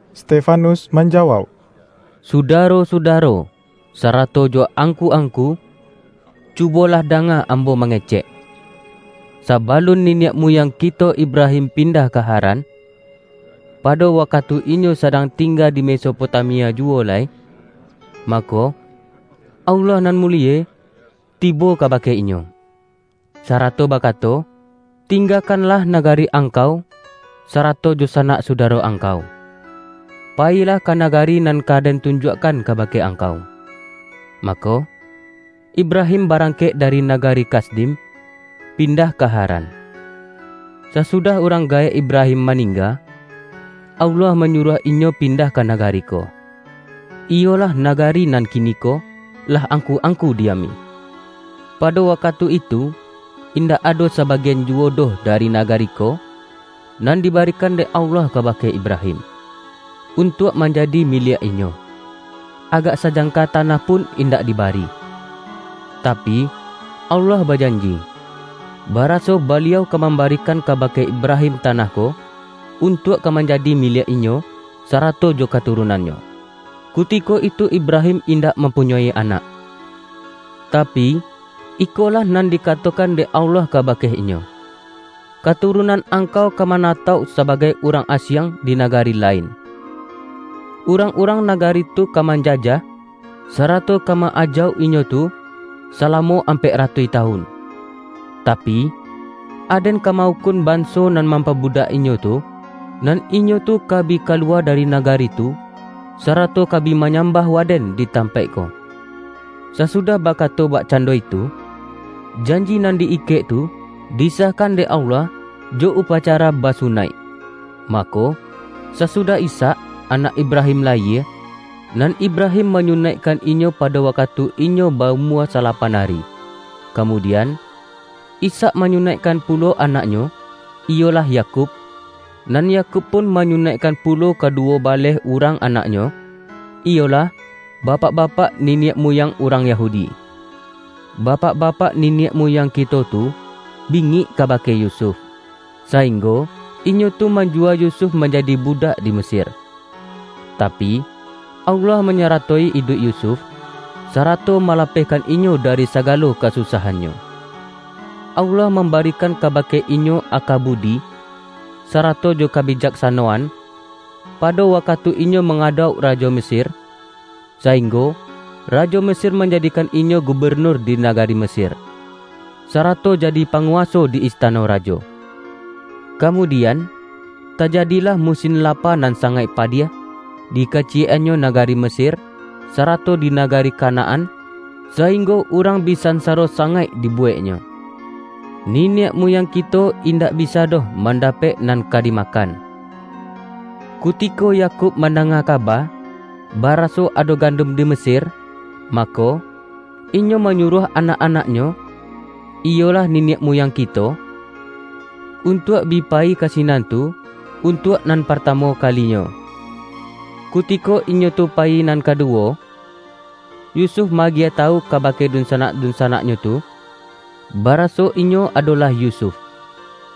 Stefanus manjawauk,”Sudaro-sudaro, sarato jo angku-angku! Cubolah danga ambo mangecek! Sabalun niniak muyang kito Ibrahim pindah ka Haran, pado wakatu inyo sadang tingga di Mesopotamia juwo lai, mako, Allah nan mulie, tibo kabake inyo, sarato bakato, ’Tinggakanlah nagari angkau, sarato jo sanak sudaro angkau. Payilah ka nagari nan ka Den tunjuakkan kabake angkau.’ Mako, Ibrahim barangkek dari nagari Kasdim, pindah ka Haran. Sasudah urang gaek Ibrahim maningga, Allah manyuruah inyo pindah ka nagari ko, iyolah nagari nan kiniko, lah angku-angku diami. Pado wakatu itu, indak ado sabagian juwo doh dari nagari ko, nan dibarikan dek Allah kabake Ibrahim, untuak manjadi miliak inyo; agak sajangka tanah pun indak dibari. Tapi, Allah bajanji, baraso Baliau ka mambarikan kabake Ibrahim tanah ko, untuak ka manjadi miliak inyo, sarato jo katurunannyo. Kutiko itu Ibrahim indak mampunyoi anak. Tapi, ikolah nan dikatokan dek Allah kabake inyo, ’Katurunan angkau ka manatauk sabagai urang asiang, di nagari lain. Urang-urang nagari tu ka manjajah, sarato ka ma-ajauk inyo tu, salamo ampek ratuih tawun. Tapi, Aden ka ma-ukun banso nan mampabudak inyo tu, nan inyo tu ka bi ka luwa dari nagari tu, sarato ka bi manyambah Waden di tampaik ko.’ Sasudah bakato bakcando itu, janji nan di-ikek tu, disahkan dek Allah, jo upacara basunaik. Mako, sasudah Ishak, anak Ibrahim layie, nan Ibrahim manyunaikkan inyo pado wakatu inyo ba-umua salapan ari. Kamudian, Ishak manyunaikkan pulo anaknyo, iyolah Yakub. Nan Yakub pun manyunaikkan pulo kaduwo baleh urang anaknyo, iyolah, bapak-bapak niniak muyang urang Yahudi. Bapak-bapak niniak muyang kito tu, bingik kabake Yusuf, sainggo inyo tu manjuwa Yusuf manjadi budak di Mesir. Tapi, Allah manyaratoi iduik Yusuf, sarato malapehkan inyo dari sagalo kasusahannyo. Allah mambarikan kabake inyo aka budi, sarato jo kabijaksanoan, pado wakatu inyo mangadauk rajo Mesir, sainggo rajo Mesir manjadikan inyo gubenur di nagari Mesir, sarato jadi panguwaso di istano rajo. Kamudian, tajadilah musin lapa nan sangaik padiah, di kaciyek-annyo nagari Mesir, sarato di nagari Kanaan, sainggo urang bi sansaro sangaik dibuweknyo. Niniak muyang kito indak bisa doh mandapek nan ka dimakan. Kutiko Yakub mandanga kaba, baraso ado gandun di Mesir, mako, inyo manyuruah anak-anaknyo, iyolah, niniak muyang kito, untuak bi payi ka sinan tu, untuak nan partamu kalinyo. Kutiko inyo tu payi nan kaduwo, Yusuf ma-agiah tawu kabake dunsanak-dunsanaknyo tu, baraso inyo adolah Yusuf.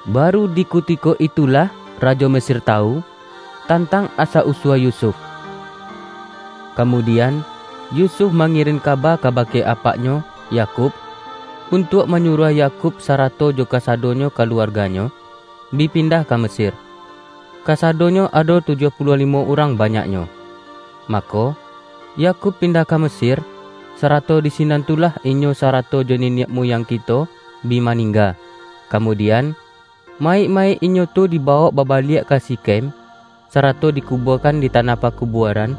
Baru di kutiko itulah rajo Mesir tawu, tantang asa-usua Yusuf. Kamudian, Yusuf mangirin kaba kabake apaknyo, Yakub, untuak manyuruah Yakub sarato jo kasadonyo kaluarganyo, bi pindah ka Mesir — kasadonyo ado tujuah puluah limo urang banyaknyo. Mako, Yakub pindah ka Mesir, sarato di sinan tu lah inyo sarato jo niniak muyang kito, bi maningga. Kamudian, mayik-mayik inyo tu dibawok babaliak ka Sikhem, sarato dikubuakan di tanah pakubuaran,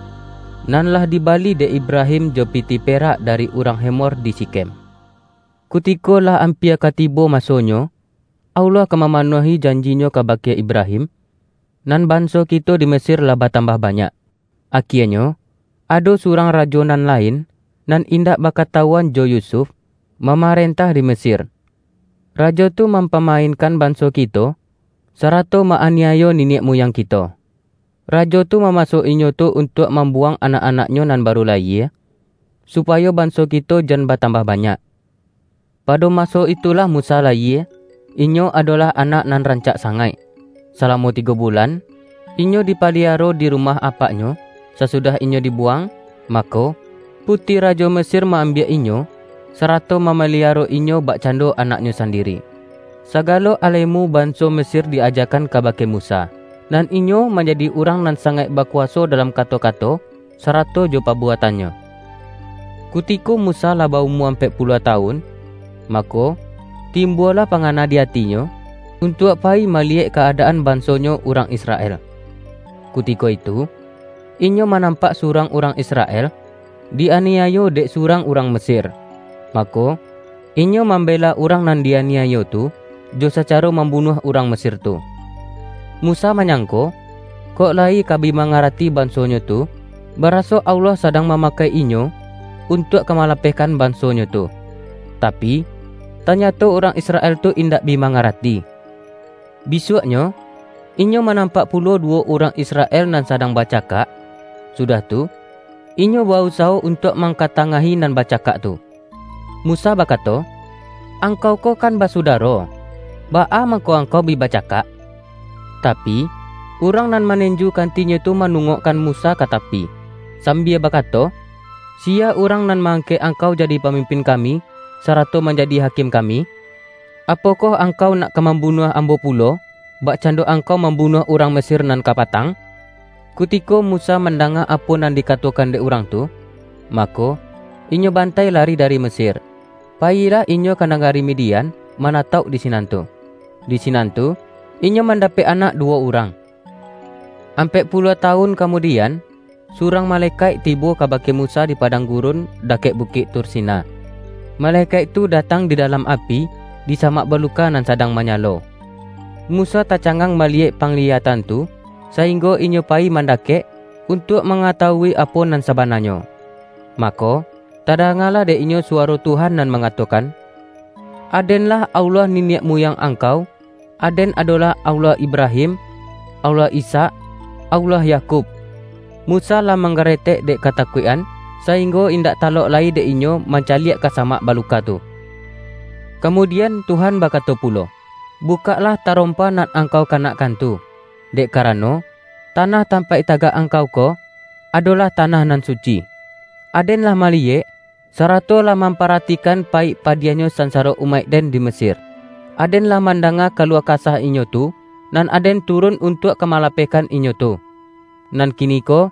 nan lah dibali dek Ibrahim jo pitih perak dari urang Hemor di Sikhem. Kutiko lah ampia ka tibo masonyo, Allah ka mamanuahi janji-Nyo kabake Ibrahim, nan banso kito di Mesir lah batambah banyak. Akienyo, ado surang rajo nan lain, nan indak bakatawuan jo Yusuf, mamarentah di Mesir. Rajo tu mampamainkan banso kito, sarato ma-aniayo niniak muyang kito. Rajo tu mamaso inyo tu untuak mambuwang anak-anaknyo nan baru layie, supayo banso kito jan batambah banyak. Pado maso itulah Musa layie; inyo adolah anak nan rancak sangaik. Salamo tigo bulan, inyo dipaliaro di rumah apaknyo, sasudah inyo dibuwang, mako, puti rajo Mesir ma-ambiak inyo, sarato mamaliaro inyo bakcando anaknyo sandiri. Sagalo alemu banso Mesir di-ajakan kabake Musa, nan inyo manjadi urang nan sangaik bakuwaso dalam kato-kato, sarato jo pabuatannyo. Kutiko Musa lah ba-umua ampek puluah tawun, mako, timbualah pangana di atinyo, untuak payi maliyek ka-adaan bansonyo urang Israel. Kutiko itu, inyo manampak surang urang Israel, di-aniayo dek surang urang Mesir; mako, inyo mambela urang nan di-aniayo tu, jo sacaro mambunuah urang Mesir tu. Musa manyangko, kok layi ka bi mangarati bansonyo tu, baraso Allah sadang mamakai inyo, untuak ka malapehkan bansonyo tu. Tapi, tanyato urang Israel tu indak bi mangarati. Bisuaknyo, inyo manampak pulo duwo urang Israel nan sadang bacakak, sudah tu, inyo ba-usawo untuak mangkatangahi nan bacakak tu. Musa bakato, ’Angkau ko kan basudaro. Baa mangko angkau bi bacakak?' Tapi, urang nan manenju kantinyo tu manungokkan Musa ka tapi, sambia bakato, ’Siya urang nan ma-angkek angkau jadi pamimpin kami, sarato manjadi hakim kami? Apokoh angkau nak ka mambunuah ambo pulo, bakcando angkau mambunuah urang Mesir nan kapatang?' Kutiko Musa mandanga apo nan dikatokan dek urang tu, mako, inyo bantai lari dari Mesir, payilah inyo ka nagari Midian, manatauk di sinan tu. Di sinan tu, inyo mandapek anak duwo urang. Ampek puluah tawun kamudian, surang malekaik tibo kabake Musa di padang gurun, dakek Bukik Tursina. Malekaik tu datang di dalam api, di samak baluka nan sadang manyalo. Musa tacangang maliyek pangliyatan tu, sainggo inyo payi mandakek, untuak mangatawui apo nan sabananyo. Mako, tadangalah dek inyo suwaro Tuhan nan mangatokan, ’Aden-lah Allah niniak muyang angkau; Aden adolah Allah Ibrahim, Allah Ishak, Allah Yakub.’ Musa lah manggaretek dek katakuik-an, sainggo indak talok lai dek inyo, mancaliak ka samak baluka tu. Kamudian Tuhan bakato pulo, ’Bukaklah tarompa nan angkau kanakkan tu, dek karano, tanah tampaik tagak angkau ko, adolah tanah nan suci. Aden lah maliyek, sarato lah mamparatikan payik padiahnyo sansaro umaik-Den di Mesir. Aden lah mandanga kaluah kasah inyo tu, nan Aden turun untuak ka malapehkan inyo tu. Nan kiniko,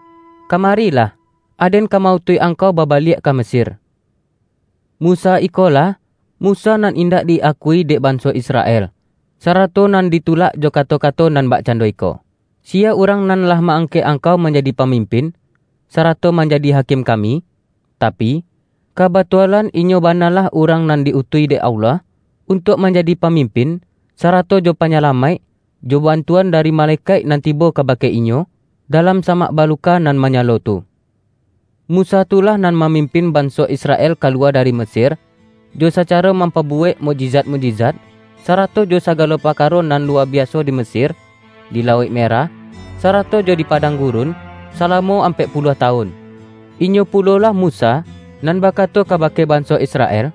kamarilah! Aden ka ma-utuih angkau babaliak ka Mesir.’ Musa ikolah, Musa nan indak di-akui dek banso Israel, sarato nan ditulak jo kato-kato nan bakcando iko, ’Siya urang nan lah ma-angkek angkau manjadi pamimpin, sarato manjadi hakim kami?' Tapi, kabatualan inyo banalah urang nan di-utuih dek Allah, untuak manjadi pamimpin, sarato jo panyalamaik, jo bantuan dari malekaik nan tibo kabake inyo, dalam samak baluka nan manyalo tu. Musa tu lah nan mamimpin banso Israel ka luwa dari Mesir, jo sacaro mampabuwek mukjizat-mukjizat, sarato jo sagalo parkaro nan luwa biaso di Mesir, di lauik Merah, sarato jo di padang gurun, salamo ampek puluah tawun. Inyo pulolah Musa, nan bakato kabake banso Israel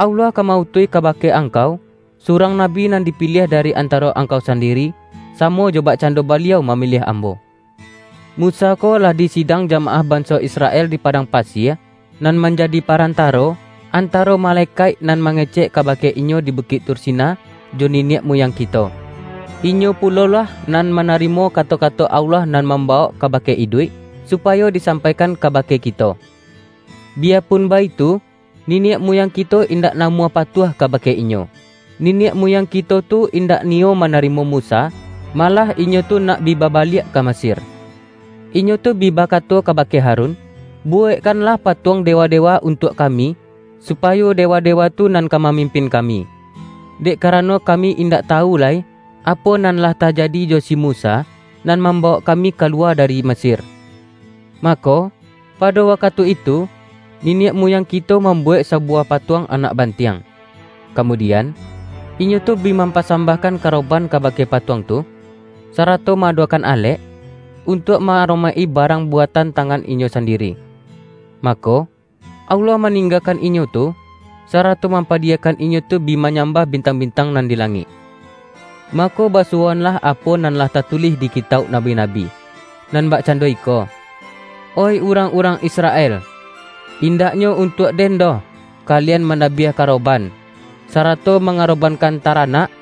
’Allah ka ma-utuih kabake angkau, surang nabi nan dipiliah dari antaro angkau sandiri, samo jo bakcando Baliau mamiliah ambo.’ Musa ko lah di sidang jamaah banso Israel di padang pasie, nan manjadi parantaro, antaro malekaik nan mangecek kabake inyo di Bukik Tursina, jo niniak muyang kito. Inyo pulolah nan manarimo kato-kato Allah nan mambawok kabake iduik, supayo disampaikan kabake kito. Biyapun baitu, niniak muyang kito indak namuah patuah kabake inyo. Niniak muyang kito tu indak niyo manarimo Musa, malah inyo tu nak bi babaliak ka Mesir. Inyo tu bi bakato kabake Harun, ’Buwekkanlah patuang dewa-dewa untuak kami, supayo dewa-dewa tu nan ka mamimpin kami. Dek karano kami indak tawu lai, apo nan lah tajadi jo si Musa, nan mambawok kami kaluwa dari Mesir!' Mako, pado wakatu itu, niniak muyang kito mambuwek sabuwah patuang anak bantiang, kamudian, inyo tu bi mampasambahkan karoban kabake patuang tu, sarato ma-adokan alek, untuak ma-aromaik-i barang buatan tangan inyo sandiri. Mako, Allah maninggakan inyo tu, sarato mampadiyakan inyo tu bi manyambah bintang-bintang nan di langik. Mako basuwoanlah apo nan lah tatulih di kitauk nabi-nabi. Nan bakcando iko, ’Oih urang-urang Israel! Indaknyo untuak Den doh, kalian mandabiah karoban, sarato mangarobankan taranak,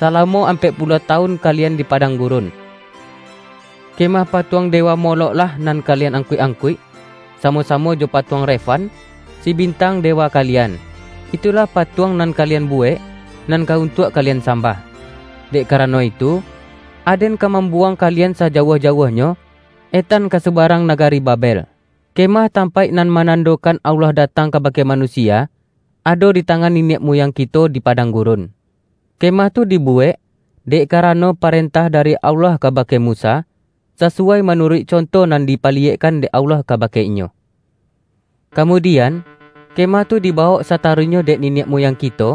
salamo ampek puluah tawun kalian di padang gurun. Kemah patuang dewa Molokh-lah nan kalian angkuik-angkuik, samo-samo jo patuang Refan, si bintang dewa kalian; itulah patuang nan kalian buwek, nan ka untuak kalian sambah. Dek karano itu, Aden ka mambuwang kalian sajauah-jauahnyo, etan ka subarang nagari Babel.’ Kemah tampaik nan manandokan Allah datang kabake manusia, ado di tangan niniak muyang kito di padang gurun. Kemah tu dibuwek, dek karano parentah dari Allah kabake Musa, sasuwai manuruik conto nan dipaliyekkan dek Allah kabake inyo. Kamudian, kemah tu dibawok sataruihnyo dek niniak muyang kito,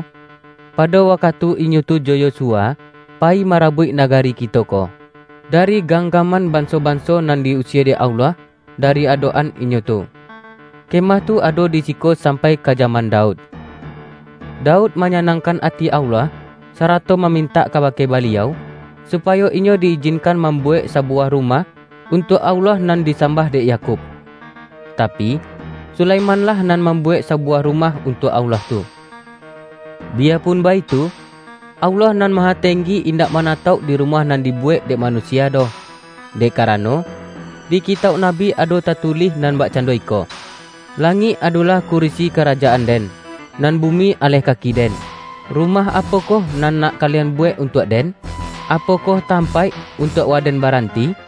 pado wakatu inyo tu jo Yosua payi marabuik nagari kito ko, dari ganggaman banso-banso nan di-usie dek Allah dari adok-an inyo tu. Kemah tu ado di siko sampai ka jaman Daud. Daud manyanangkan ati Allah, sarato mamintak kabake Baliau, supayo inyo di-ijinkan mambuwek sabuwah rumah, untuak Allah nan disambah dek Yakub. Tapi, Sulaiman-lah nan mambuwek sabuwah rumah untuak Allah tu. Biyapun baitu, Allah Nan Mahatenggi indak manatauk di rumah nan dibuwek dek manusia doh; dek karano di kitauk nabi ado tatulih nan bakcando iko, ’Langik adolah kurisi karajaan-Den, nan bumi aleh kaki-Den. Rumah apokoh nan nak kalian buwek untuak Den? Apokoh tampaik, untuak Waden baranti?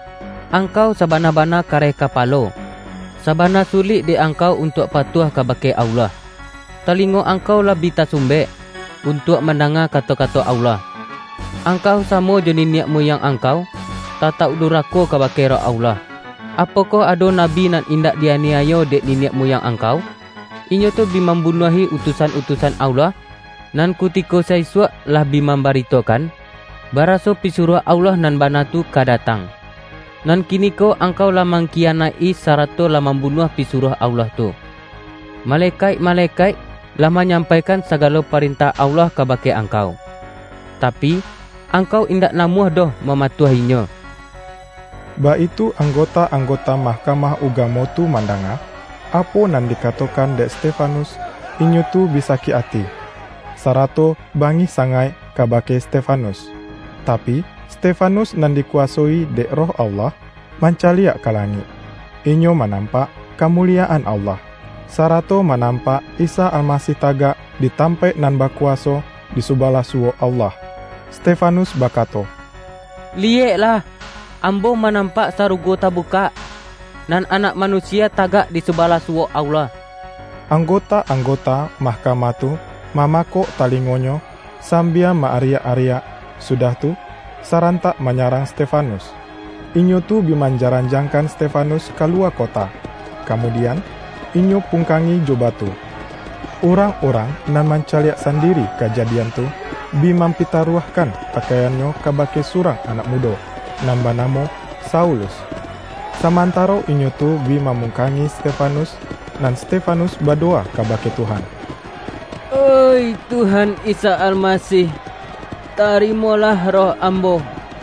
Angkau sabana-bana kareh kapalo, sabana sulik dek angkau untuak patuah kabake Allah! Talingo angkau lah bi tasumbek, untuak mandanga kato-kato Allah! Angkau samo jo niniak muyang angkau; tatauk durako kabake Roh Allah! Apokoh ado nabi nan indak di-aniayo dek niniak muyang angkau? Inyo tu bi mambunuahi utusan-utusan Allah, nan kutiko sa-isuak lah bi mambaritokan, baraso Pisuruah Allah nan bana tu, ka datang. Nan kiniko angkau lah mangkiyanaik-i, sarato lah mambunuah Pisuruah Allah tu. Malekaik-malekaik lah manyampaikan sagalo parentah Allah kabake angkau, tapi, angkau indak namuah doh mamatuahinyo!” Baitu anggota-anggota Mahkamah Ugamo tu mandanga, apo nan dikato-kan dek Stefanus, inyo tu bi sakik ati, sarato bangih sangaik kabake Stefanus. Tapi, Stefanus nan dikuwasoi dek Roh Allah, mancaliak ka langik. Inyo manampak kamuliyaan Allah, sarato manampak Isa Almasih tagak di tampaik nan bakuwaso, di subalah suwok Allah. Stefanus bakato,”Liyeklah, ambo manampak sarugo tabukak, nan Anak Manusia tagak di subalah suwok Allah!” Anggota-anggota mahkamah tu mamakok talingonyo sambia ma-ariak-ariak, sudah tu, sarantak manyarang Stefanus. Inyo tu bi manjaranjangkan Stefanus ka luwa kota, kamudian, inyo pungkangi jo batu. Urang-urang nan mancaliak sandiri kajadian tu, bi mampitaruahkan pakaiannyo kabake surang anak mudo, nan banamo Saulus. Samantaro inyo tu bi mamungkangi Stefanus, nan Stefanus badowa kabake Tuhan,”Oih Tuhan Isa Almasih, tarimolah roh ambo!”